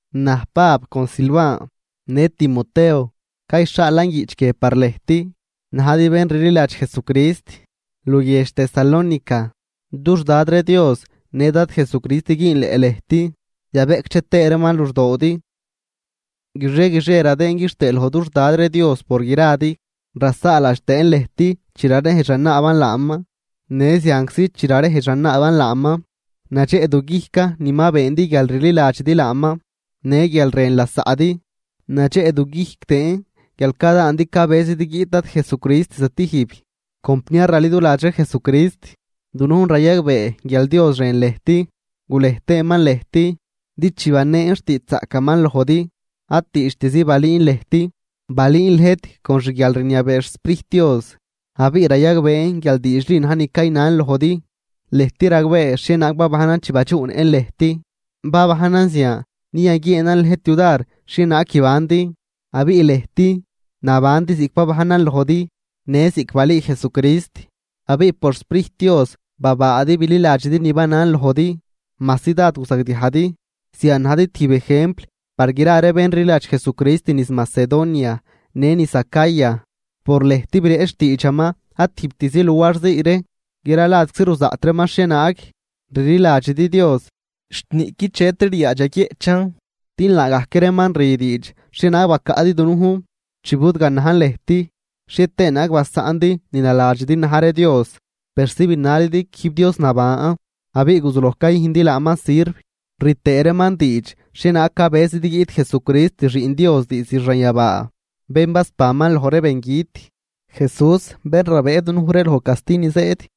Naj, Pab con Silvan në Timoteo, cayxhaalan guiꞌch guie par lëjt najdi bén rliladx Jesucrist luguiedx Tesalónica, dux Dad ree Dios në Dad Jesucrist güünleꞌ lëjt yabeꞌcdxe tëë reeman luxdoodi. Guixie guixie radëën quixtëë loj dux Dad ree Dios por gradi, rasaaladx tëën lëjt chi rarejdx ranaaban laaman. Në zianczi chi rarejdx ranaaban laaman, nadxeꞌduguijcan ni ma beendi guial rliladxidi laaman, në guial rën lasaꞌdi, nadxeꞌduguijc tëën guial cadaandi cabëzidi guiꞌt Dad Jesucrist stijb. Compniar raliduladx ree Jesucrist, dunujn rayagbee guial Dios rën lëjt, gulej tëëman lëjt. Din chi baneen xtiidxzaꞌcaman lojdi, ad diidxtizi balüün lëjt, balüün lëjt con xguialrniabee xSprijt Dios abiꞌ rayagbeen guial diidxli na̱j ni caynan lojdi. Lëjt ragbee xhienaag babajnan chi badxuꞌnëꞌn lëjt, babajnan zian din yaguieenan lëjt yudar xhienaag guibandi. Abiꞌ lëjt nabandi ziꞌc babajnan lojdi në ziꞌc balüü Jesucrist, abiꞌ por xSprijt Dios babaadi bililadxidi ni banan lojdi, majsi dád guzagdiajdi. Zian najdi tijb ejempl par gra ree bén rliladx Jesucrist niz Macedonia në niz Acaya. Por lëjt bireꞌch xtiidxaman ad tijbtizi luarzii ree, gra ladczi ruzaꞌt reeman xhienaag rliladxidi Dios, xt niꞌqui chetri ryaadx yaguieꞌchan. Din laagajc reeman rü diidx xhienaag bacaꞌdi dunujn chi budganajn lëjt, xhie tëë naag basaꞌndi ni naladxidi na̱j ree dios persi binalidi quijb Dios naban abiꞌ guzuloj cayüjndi laaman sirv. Rü tëë reeman diidx xhienaag cabëzidi guiꞌt Jesucrist Xiꞌn Dios diizd xanyabaa, bén basbanman loj ree bengüt, Jesús bén rabëë dunuj ree loj casti ni zëëd.